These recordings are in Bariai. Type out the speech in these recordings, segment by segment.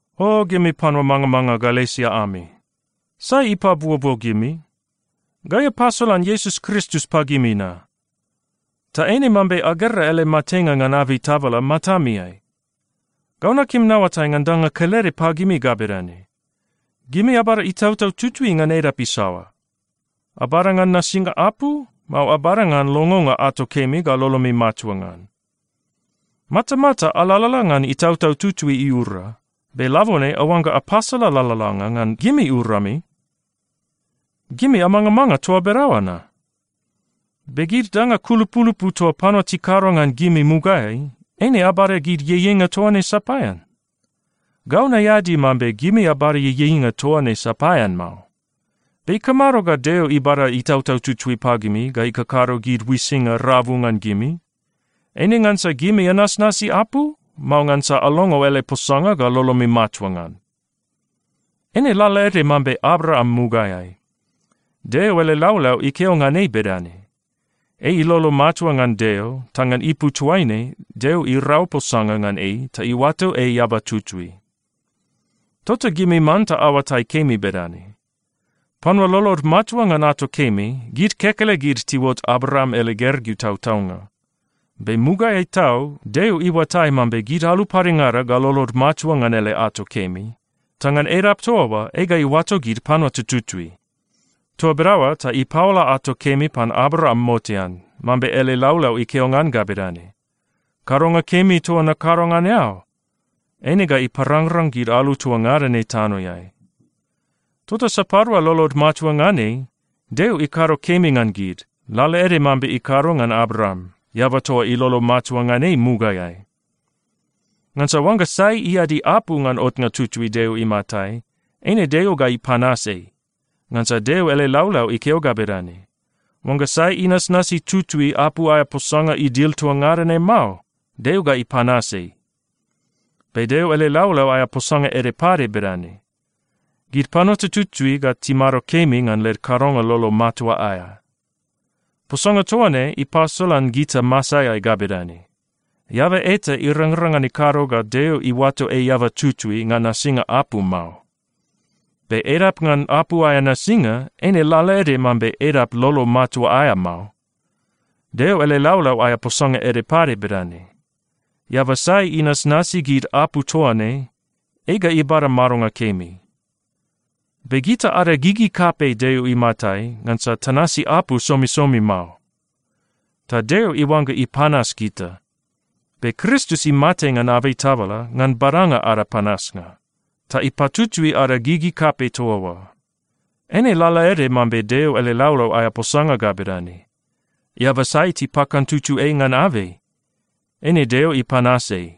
O gimi panua mangamanga Galesia ami! Sai ipabuobuo gimi? Gai apasolan Iesus Kristus pagimi na. Ta eine mambe agera ele matenga ngan abei tabala matamiai. Gau nakim naoatai ngan danga kelede pagimi ga bedane: Gimi abada Itautau Tutui ngan edap isaoa? Abada ngan nasinga apu, mao abada ngan longonga ato kemi ga lolomi matua ngan? Matamata alalala ngan Itautau Tutui iura, be labone aoangga apasala lalalanga ngan gimi urami? Gimi amangamanga toa bedaoa na? Be gid danga kulupulupu toa panua tikado ngan gimi mugaeai, eine abada gid ieieinga toa ne sapaean? Gau naeadi mambe gimi abada ieieinga toa ne sapaean mao. Be ikamado ga Deo ibada Itautau Tutui pagimi ga ikakado gid uisinga rabu ngan gimi? Eine ngansa gimi anasnasi apu, mao ngansa alongo ele posanga ga lolomi matua ngan? Eine lalaede mambe Abraam mugaeai. Deo ele laulau ikeo ngan ei bedane, “Ei ilolo matua ngan Deo, ta ngan ipu toaine Deo irau posanga ngan ei ta iuato ei eaba tutui.” Tota gimi manta aoatai kemi bedane: Panua lolod matua ngan ato kemi, gid kekelegid tiuot Abraam ele gergeu tautaunga. Be mugaeai tau, Deo iuatai mambe gid alu padengada ga lolod matua ngan ele ato kemi, ta ngan edap toa oa ei ga iuato gid panua tututui. Toa bedaoa ta ipaola ato kemi pan Abraam motean, mambe ele laulau ikeo ngan ga bedane, “Kadonga kemi toa nakado ngan eao, eine ga iparangrang gid alu toa ngada ne tanoeai.” Tota sapadua lolod matua ngan ei, Deo ikado kemi ngan gid, lalaede mambe ikado ngan Abraam, eaba toa ilolo matua ngan ei mugaeai. Ngansa oangga sai iadi apu ngan otnga tutui Deo imatai, eine Deo ga ipanas ei. Ngansa Deo ele laulau ikeo ga bedane, “Oangga sai inasnasi tutui apu aea posanga idil toa ngada ne mao, Deo ga ipanas ei.” Be Deo ele laulau aea posanga ede pade bedane, “Gid panua tututui ga timado kemi ngan led kadonga lolo matua aea.” Posanga toa ne ipasolan gita masaeai ga bedane: Eaba eta irangrang ngan ikado ga Deo iuato ei eaba tutui ngan nasinga apu mao. Be edap ngan apu aea nasinga, eine lalaede mambe edap lolo matua aea mao. Deo ele laulau aea posanga ede pade bedane, “Eaba sai inasnasi gid apu toa ne, ei ga ibada madonga kemi.” Be gita ada gigi kapei Deo imatai, ngansa tanasi apu somisomi mao, ta Deo iuangga ipanas gita. Be Kristus imate ngan abei tabala ngan badanga ada panasnga, ta ipatutui ada gigi kapei toa oa. Eine lalaede mambe Deo ele laulau aea posanga ga bedane, “Eaba sai tipakantutu ei ngan abei, eine Deo ipanas ei.”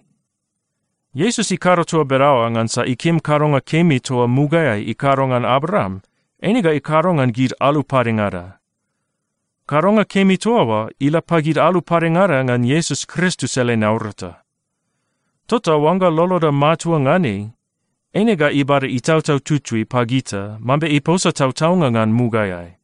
Iesus ikado toa bedaoa ngansa ikim kadonga kemi toa mugaeai ikado ngan Abraam, eine ga ikado ngan gid alu padengada. Kadonga kemi toa oa ila pagid alu padengada ngan Iesus Kristus ele naurata. Tota oangga loloda matua ngan ei, eine ga ibada Itautau Tutui pagita mambe iposa tautaunga ngan mugaeai.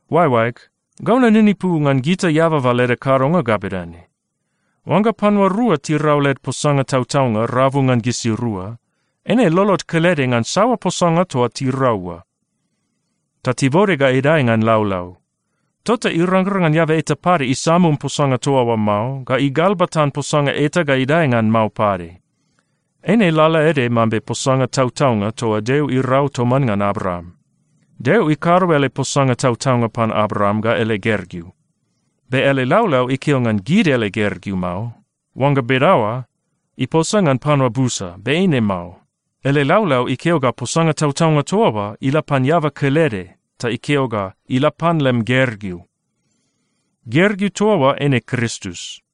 Oaeoaeg, gau naninipu ngan gita eababa leda kadonga ga bedane: Oangga panua rua tirau led posanga tautaunga rabu ngan gisirua, eine lolod kelede ngan saoa posanga toa tirau oa, ta tibode ga idae ngan laulau. Tota irangrang ngan eaba eta pade isamum posanga toa oa mao, ga igalbatan posanga eta ga idae ngan mao pade. Eine lalaede mambe posanga tautaunga toa Deo irau toman ngan Abraam. Deo ikado ele posanga tautaunga pan Abraam ga ele gergeu. Be ele laulau ikeo ngan gid ele gergeu mao. Oangga bedaoa, iposa ngan panua busa, be eine mao. Ele laulau ikeo ga posanga tautaunga toa oa ila pan eaba kelede ta ikeo ga, “Ila pan lem gergeu.” Gergeu toa oa eine Kristus.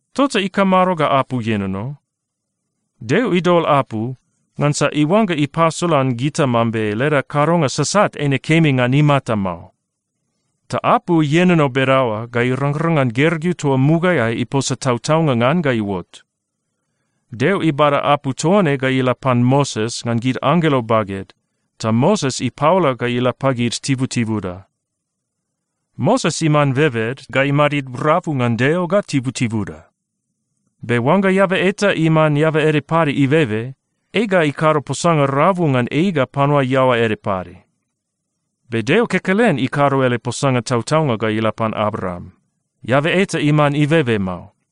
Tota ikamado ga apu ienono? Deo idol apu ngansa iuangga ipasolan gita mambe leda kadonga sasat eine kemi ngan imata mao. Ta apu ienono bedaoa ga irangrang ngan gergeu toa mugaeai iposa tautaunga ngan ga iuot. Deo ibada apu toa ne ga ila pan Moses ngan gid anggelo baged, ta Moses ipaola ga ila pagid tibutibuda. Moses iman bebed ga imadid rabu ngan Deo ga tibutibuda. Be oangga eaba eta iman eaba ede pade ibebe, ei ga ikado posanga rabu ngan ei ga panua iaoa ede pade. Be Deo kekelen ikado ele posanga tautaunga ga ila pan Abraam. Eaba eta iman ibebe mao.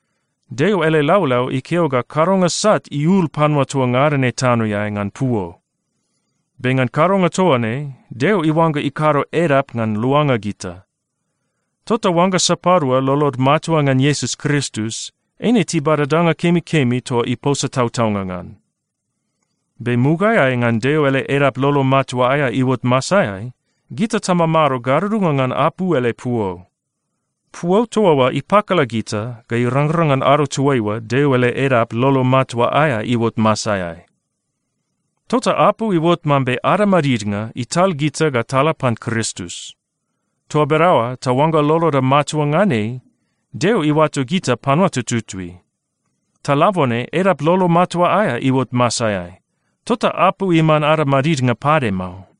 Deo ele laulau ikeo ga kadonga sat iul panua toa ngada ne tanoeai ngan puo. Be ngan kadonga toa ne, Deo iuangga ikado edap ngan luanga gita. Tota oangga sapadua lolod matua ngan Iesus Kristus, eine tibada danga kemikemi toa iposa tautaunga ngan. Be mugaeai ngan Deo ele edap lolo matua aea iuot masaeai, gita tamamado gadudunga ngan apu ele puo. Puo toa oa ipakala gita ga irangrang ngan ado toaiua Deo ele edap lolo matua aea iuot masaeai. Tota apu iuot mambe ada madidnga ital gita ga tala pan Kristus. Toa bedaoa ta oangga loloda matua ngan ei, Deo iuato gita panua tututui. Ta labone edap lolo matua aea iuot masaeai, tota apu iman ada madidnga pade mao.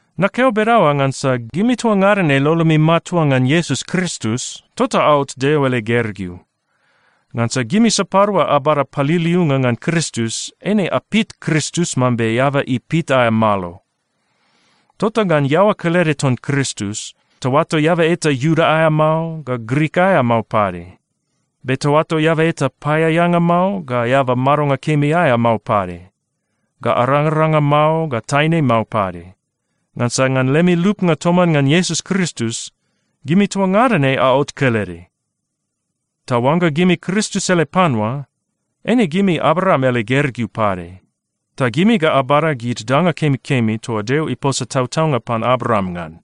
Nakeo bedaoa ngansa gimi toa ngada ne lolomi matua ngan Iesus Kristus, tota aot Deo ele gergeu. Ngansa gimi sapadua abada paliliunga ngan Kristus, eine apit Kristus mambe eaba ipit aea malo. Tota ngan iaoa kelede ton Kristus, taoato eaba eta Iuda aea mao, ga Grik aea mao pade, be taoato eaba eta paeaeanga mao, ga eaba madonga kemi aea mao pade, ga arangaranga mao, ga taine mao pade, ngansa ngan lemi lupnga toman ngan Iesus Kristus, gimi toa ngada ne aot kelede. Ta oangga gimi Kristus ele panua, eine gimi Abraam ele gergeu pade. Ta gimi ga abada gid danga kemikemi toa Deo iposa tautaunga pan Abraam ngan.